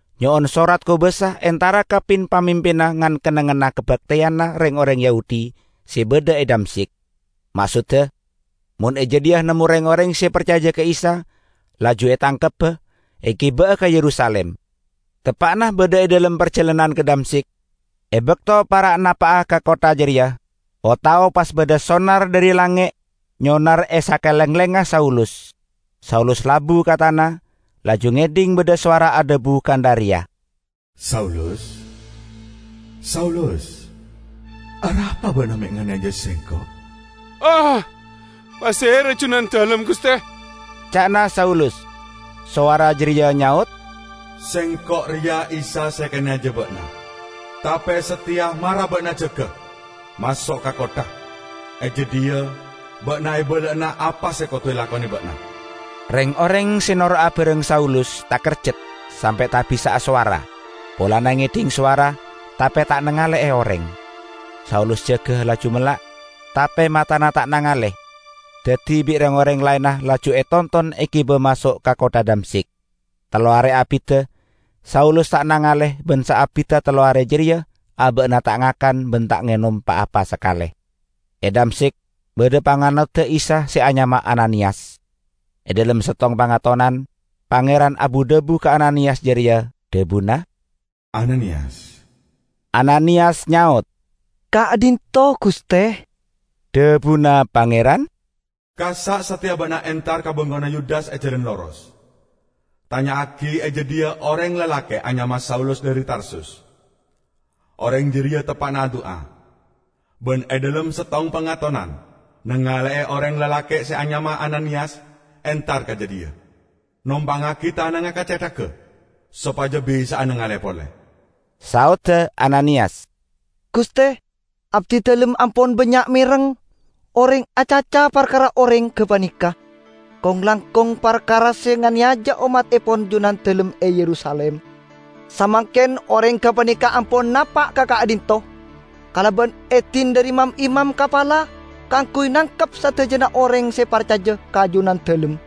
nyo'on sorat kobasa entara ka pin-pamimpinna ngan-kennengnganna kabakteyanna reng-oreng Yahudi se badha e Damsyik, maksodda, mon e jadhiya nemmo reng-oreng se parcaja ka Isa, laju etangkebba, egiba'a ka Yerusalim. Teppa'na badha e dhalem parjalanan ka Damsyik, e bakto para' napa'a ka kottha jareya, o-tao pas badha sonar dhari langnge' nyonar e sakalenglengnga Saulus. Saulus labu ka tana, laju ngedhing badha sowara adhabu kantha reya, "Saulus, Saulus! Arapa ba'na me' nganeyaja Sengko'?" "Pasera Junandalem, Guste?" ca'na Saulus. Sowara jareya nyaot, "Sengko' reya Isa se ekaneyaja ba'na. Tape sateya mara ba'na jaga, maso' ka kottha. E jadhiya ba'na ebala'ana apa se kodu elakone ba'na." Reng-oreng se noro' abareng Saulus takerjat sampe' ta' bisa asowara; polana ngedhing sowara tape ta' nangale'e oreng. Saulus jaga laju mella', tape matana ta' nangale. Daddi bi' reng-oreng laenna laju e tonton egiba maso' ka kottha Damsyik. Tello are abidda Saulus ta' nangale ban saabidda tello are jareya aba'na ta' ngakan ban ta' ngenom pa-apa sakale. E Damsyik badha panganodda Isa se anyama Ananiyas. E dhalem settong pangatonan, Pangeran abu-dhabu ka Ananiyas jareya, dhabuna, "Ananiyas!" Ananiyas nyaot, "Ka'dhinto', Guste." Dhabuna Pangeran, "Kassa' sateya ba'na entar ka bengkona Yudas e Jalan Loros. Tanya'agi e jadhiya oreng lalake' anyama Saulus dhari Tarsus. Oreng jareya teppa'na adu'a, ban e dhalem settong pangatonan nangale'e oreng lalake' se anyama Ananiyas entar ka jadhiya, nompangngagi tanangnga ka cethagga sopaja bisa'a nangale pole." Saodda Ananiyas, "Guste, abdidalem ampon bannya' mereng oreng acaca parkara oreng gapaneka, kong-langkong parkara se nganeyaja ommattepon Junandalem e Yerusalim. Samangken oreng gapaneka ampon napa' ka ka'dhinto' kalaban edin dhari mam-imam kapala kaangguy nangkep sadajana oreng se parcaja ka Junandalem."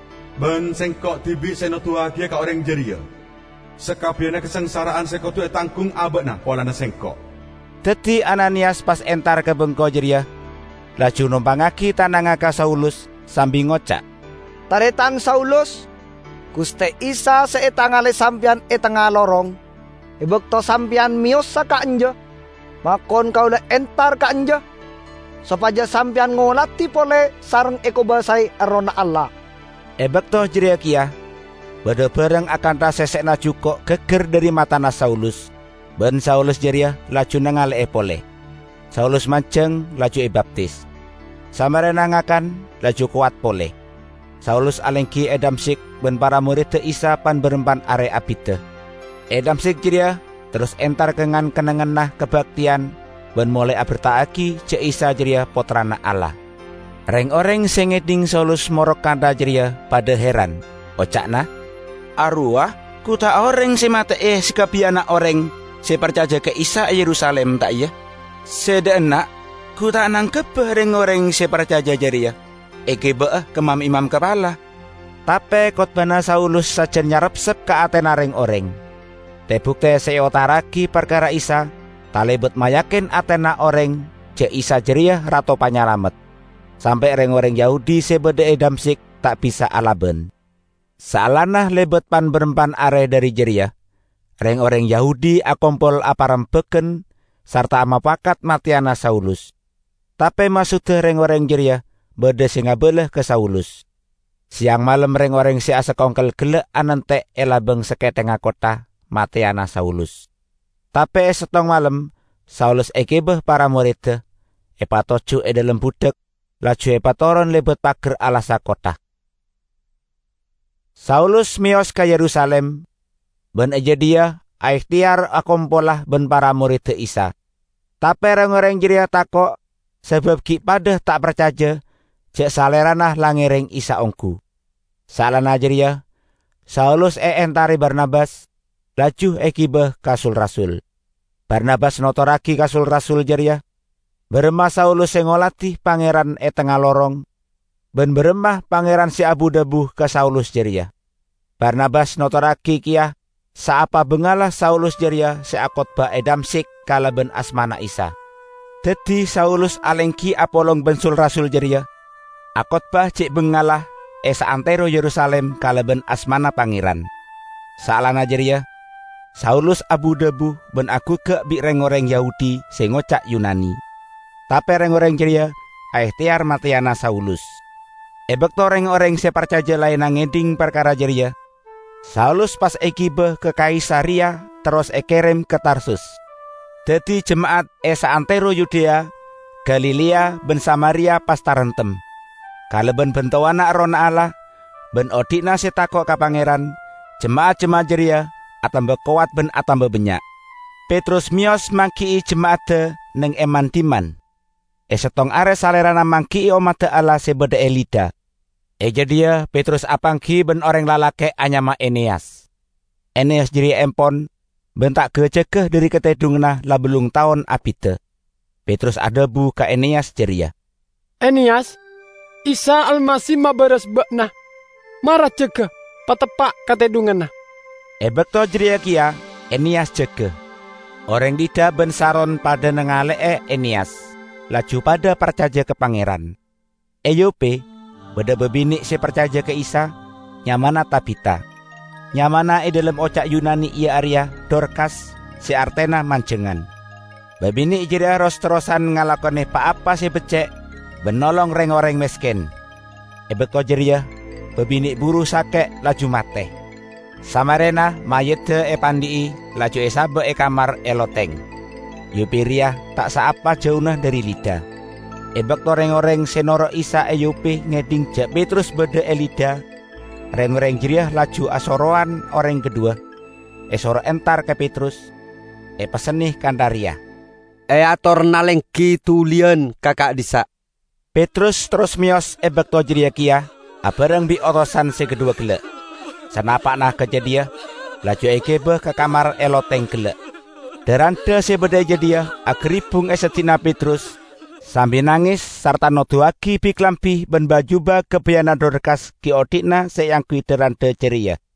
Ban Sengko' dibi' se noduwagiya ka oreng jareya sakabbiyanna kasangsara'an se kodu etanggung aba'na polana Sengko'." Daddi Ananiyas pas entar ka bengko jareya, laju nompangngagi tanangnga ka Saulus sambi ngoca', "Taretan Saulus, Guste Isa se etangale sampeyan e tengnga lorong e bakto sampeyan meyosa ka'anja, makon kaula entar ka'anja sopaja sampeyan ngoladi pole sareng ekobasae Errohna Allah." E bakto jareya keya badha barang akantha sesse'na juko' gaggar dhari matana Saulus, ban Saulus jareya laju nangale'e pole. Saulus manjeng, laju ebaptis. Samarena ngakan laju kowat pole. Saulus alenggi e Damsyik ban para moredda Isa pan-barampan are abidda. E Damsyik jareya terros entar ka ngan-kennengnganna kabakteyan, ban molae aberta'agi ja' Isa jareya Pottrana Allah. Reng-oreng se ngedhing Saulus morok kantha jareya padha heran. Oca'na, "Arowa gu ta' oreng se mate'e sakabbiyanna oreng se parcaja ka Isa e Yerusalim, ta' iya? Se dha' enna' gu ta' nangkebba reng-oreng se parcaja jareya, egiba'a ka mam-imam kapala!" Tape kotbahna Saulus sajan nyarepsep ka atena reng-oreng. Te-bukte se eotara'agi parkara Isa talebat mayakin atena oreng ja' Isa jareya Rato Panyalamet, sampe' reng-oreng Yahudi se badha e Damsyik ta' bisa alaban. Saellana lebat pan-barampan are dhari jareya, reng-oreng Yahudi akompol aparembagan sarta mopakat mateyana Saulus. Tape maksodda reng-oreng jareya badha se ngabala ka Saulus. Seyang malem reng-oreng se asakongkel gella' anante' e labang sakethengnga kottha, mateyana Saulus. Tape e settong malem Saulus egiba para moredda, epatoju' e dhalem budhak, laju epatoron lebat pagar alassa kottha. Saulus meyos ka Yerusalim, ban e jadhiya aehteyar akompola ban para moredda Isa. Tape reng-oreng jareya tako' sabab gi' padha ta' parcaja ja' salerana la ngereng Isa onggu. Saellana jareya Saulus eentare Barnabas, laju egiba ka sul-rasul. Barnabas notorragi ka sul-rasul jareya baramma Saulus se ngoladi Pangeran e tengnga lorong ban baramma Pangeran se abu-dhabu ka Saulus jareya. Barnabas notorragi keya saapa bangalla Saulus jareya se akotbah e Damsyik kalaban asmana Isa. Daddi Saulus alenggi apolong ban sul-rasul jareya, akotbah ce' bangalla e saantero Yerusalim kalaban asmana Pangeran. Salaenna jareya Saulus abu-dhabu ban aguggak bi' reng-oreng Yahudi se ngoca' Yunani, tape reng-oreng jareya aehteyar mateyana Saulus. E bakto reng-oreng se parcaja laenna ngedhing parkara jareya, Saulus pas egiba ka Kaisareya, terros ekerem ka Tarsus. Daddi jema'at e saantero Yudea, Galilea ban Samaria pas taremtem. Kalaban bantowanna Errohna Allah, ban odhi'na se tako' ka Pangeran, jema'at-jema'at jareya atamba kowat ban atamba bannya'. Petrus meyos manggi'i jema'adda neng e man-dhimman. E settong are salerana manggi'i ommadda Allah se badha e Lida. E jadhiya Petrus apanggi ban oreng lalake' anyama Eneyas; Eneyas jareya empon ban ta' ga-jaga dhari katedhunganna la ballung taon abidda. Petrus adhabu ka Eneyas jareya, "Eneyas, Isa Almasih mabaras ba'na. Mara jaga, pateppa' katedhunganna." E bakto jareya keya Eneyas jaga. Oreng Lida ban Saron padha nangale'e Eneyas, laju padha parcaja ka Pangeran. E Yope badha babine' se parcaja ka Isa, nyamana Tabita. (Nyamana e dhalem oca' Yunani iya areya Dorkas se artena manjangan). Babine' jareya ros-terrosan ngalakone pa-apa se becce' ban nolong reng-oreng mesken. E bakto jareya babine' buru sake' laju mate. Samarena mayyidda epandhi'i, laju esaba' e kamar e loteng. Yope reya ta' saapa jauna dhari Lida. E bakto reng-oreng se noro' Isa e Yope ngedhing ja' Petrus badha e Lida, reng-oreng jareya laju asorowan oreng kadhuwa, esoro entar ka Petrus, epessenne kantha reya, "Eatorana lenggi duliyan ka ka'dhissa'." Petrus terros meyos e bakto jareya keya abareng bi' otosan se kadhuwa gella'. Sanapa'na ka jadhiya laju egiba ka kamar e loteng gella'. Dha-randha se badha e jadhiya agaribbung e seddi'na Petrus sambi nanges sarta noduwagi bi-kalambi ban ba-juba gabayanna Dorkas gi' odhi'na se eangguy dha-randha jareya.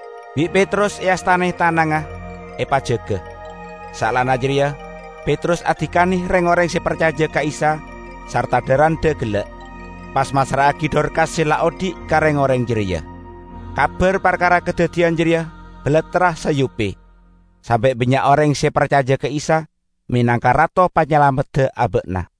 Bi' Petrus eastane tanangnga, epajaga. Saellana jareya Petrus adikane reng-oreng se parcaja ka Isa sarta dha-randha gella', pas massra'agi Dorkas se la odhi' ka reng-oreng jareya. Kabar parkara kadaddiyan jareya balattra sa Yope, sampe' bannya' oreng se parcaja ka Isa menangka Rato Panyalamedda aba'na.